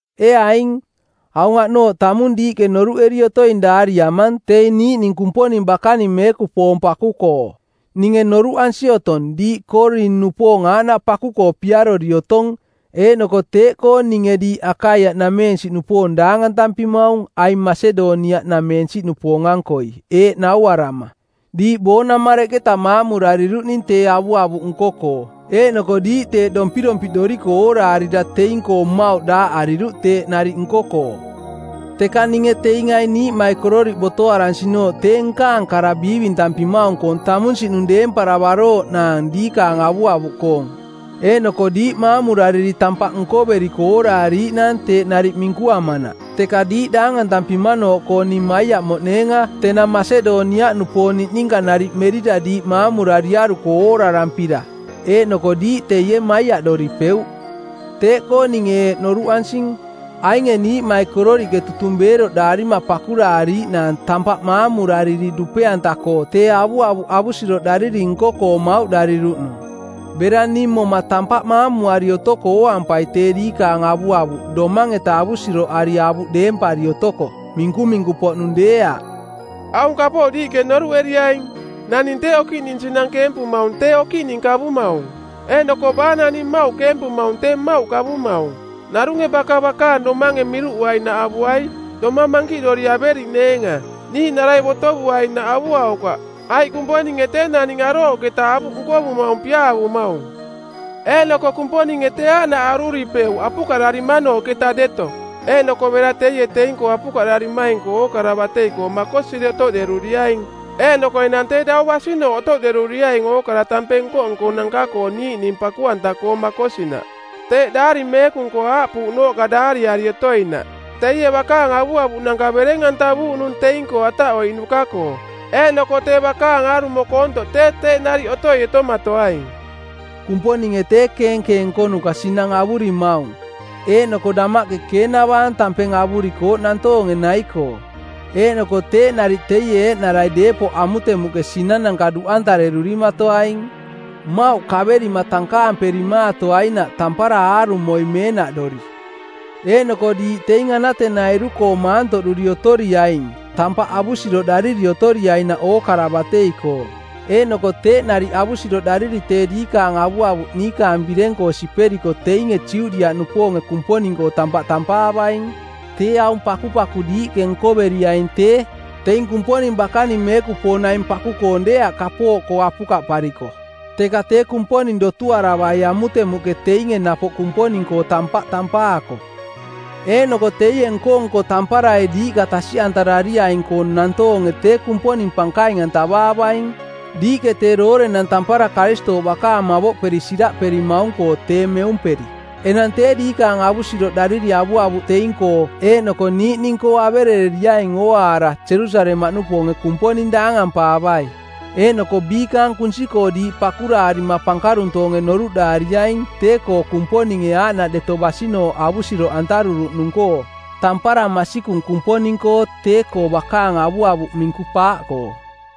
Ee aing, aung aꞌnooꞌ tamung diiꞌke noruꞌeri otoing daariamang teing niiꞌning Kumponing bakaning meekupoong paku-koo. Ninge noruꞌansi otong diiꞌ Koorin-nupoong aaꞌnaꞌ paku-koo piarori otong, eeꞌnoko teeꞌkoo ninge diiꞌ Akaiaꞌnameensiꞌnupoong daangantampimaung aing Masedoniaꞌnameensiꞌnupoong-ankoi eeꞌ nauarama: diiꞌ boonamareꞌketa maamurariruꞌning tee avuavuꞌ nko-koo eeꞌnoko diiꞌ teeꞌ dompirompiꞌdoriko ooraarira teing-koo mmauꞌ daaꞌariruꞌ teeꞌ nariꞌ nko-koo. Teka ninge teing aing niiꞌmaikororiꞌ botoaransinooꞌ tee nkaang kara biivintampimaung-koong tamunsiꞌnung deemparavarooꞌnaang diikaang avuavuꞌkoong eeꞌnoko diiꞌ maamurariri tampaꞌ nkoveriko ooraariiꞌnaang teeꞌ nariꞌ minkuamanaꞌ. Teka diiꞌ daangantampimanooꞌkoo ning maiaꞌmoꞌneenga tenang Masedoniaꞌnameensiꞌnupoong niꞌninka nariꞌ merira diiꞌ maamurariaruko oorarampira. Eeꞌnoko diiꞌ teie, maiaꞌdoripeuꞌ. Teeꞌkoo ninge eeꞌ noruꞌansing: ainge niiꞌmaikororiꞌke tutung beeroꞌdaarima pakuraariiꞌ naang tampaꞌ maamurariri dupe-anta-koo tee avuavuꞌ avusiroꞌdariri nko-koo mauꞌdariruꞌnung. Bera ning moma tampaꞌ maamuari otoko ooampai tee diikaang avuavuꞌ domang-eta avusiroꞌari avuꞌ deempari otoko, minkuminku-poꞌnung deeaꞌ. Aung kapooꞌ diiꞌke noruꞌeriaing: Naning tee okiꞌning sinang keempumaung tee okiꞌning kavumaung. Eeꞌnoko baa naning mmauꞌ keempumaung tee mmauꞌ kavumaung. Narunge baka bakaang domange miruꞌuainaꞌ avuai, domang mankiꞌdori averiꞌneenga. Niiꞌnarai botovuainaꞌ avuaukaꞌ, aiꞌ Kumponinge tee naning arooꞌketa avuꞌ nkovumaung piaavumaung. Eeꞌnoko Kumponinge tee aaꞌnaꞌ aruripeuꞌ apukaꞌdarimanooꞌketa deto, eeꞌnoko bera teie teing-koo apukaꞌdarimaing-koo ookara batei-koo makosiri otoꞌderuriaing, eeꞌnoko enang tee dau basinooꞌ otoꞌderuriaing ookara tampeng nko-nkonanka-koo niiꞌning paku-anta-koo makosinaꞌ. Teeꞌ Daari Meekung-koo aaꞌpuuꞌnooꞌka daariari otoinaꞌ, “Teie bakaang avuavuꞌnanka bereng-antavuuꞌnung teing-koo ataꞌoiꞌnuka-koo, eeꞌnoko tee bakaang aarumo koontoꞌ tee teeꞌ nariꞌ otoi otomatoaing.” Kumponinge tee keenkeeng nkonuka sinang avurimaung eeꞌnoko damaꞌke keenavaang tampeng avurikooꞌ nantoonge nai-koo, eeꞌnoko teeꞌ nariꞌ teie eeꞌnarai deepoꞌ amutemuꞌke sinananka duꞌantarerurimatoaing, mmauꞌ kaverima tankaamperimaatoainaꞌ tampara aarumoi meenaꞌdori. Eeꞌnoko diiꞌ teing anatenairu-koo maantoꞌduri otoriaing tampaꞌ avusiroꞌdariri otoriainaꞌ ookara batei-koo, eeꞌnoko teeꞌ nariꞌ avusiroꞌdariri tee diikaang avuavuꞌ niikaang bireng-koo siperiko teinge Judiaꞌnupoonge Kumponing-koo tampaꞌ tampaavaing. Tee aung pakupaku diiꞌke nkoveriaing tee, teing Kumponing bakaning meekupoong naing paku-koong deeaꞌ kapooꞌkoo apukaꞌpariko, teka tee Kumponing dotuaravai amutemuꞌke teinge napoꞌ Kumponing-koo tampaꞌ tampaako. Eeꞌnoko teie nko-nko tamparai diiꞌka tasiꞌantarariaing-koo nantoonge tee Kumponing pankaing-antavaavaing, diiꞌke tee doorenang tampara Karistooꞌ bakaang mavoꞌperi siraꞌperimaung-koo tee meumperi. Enang tee diikaang avusiroꞌdariri avuavuꞌ teing-koo eeꞌnoko niiꞌning-koo averereriaing ooaara Jerusalemaꞌnupoonge Kumponing daangampaavai. Eeꞌnoko biikaang kunsi-koo diiꞌ pakuraarima pankaruntoonge noruꞌdaariaing tee-koo Kumponinge aaꞌnaꞌ deto basinooꞌ avusiroꞌantaruruꞌnung-koo. Tampara masikung Kumponing-koo tee-koo bakaang avuavuꞌ minku-paaꞌkoo.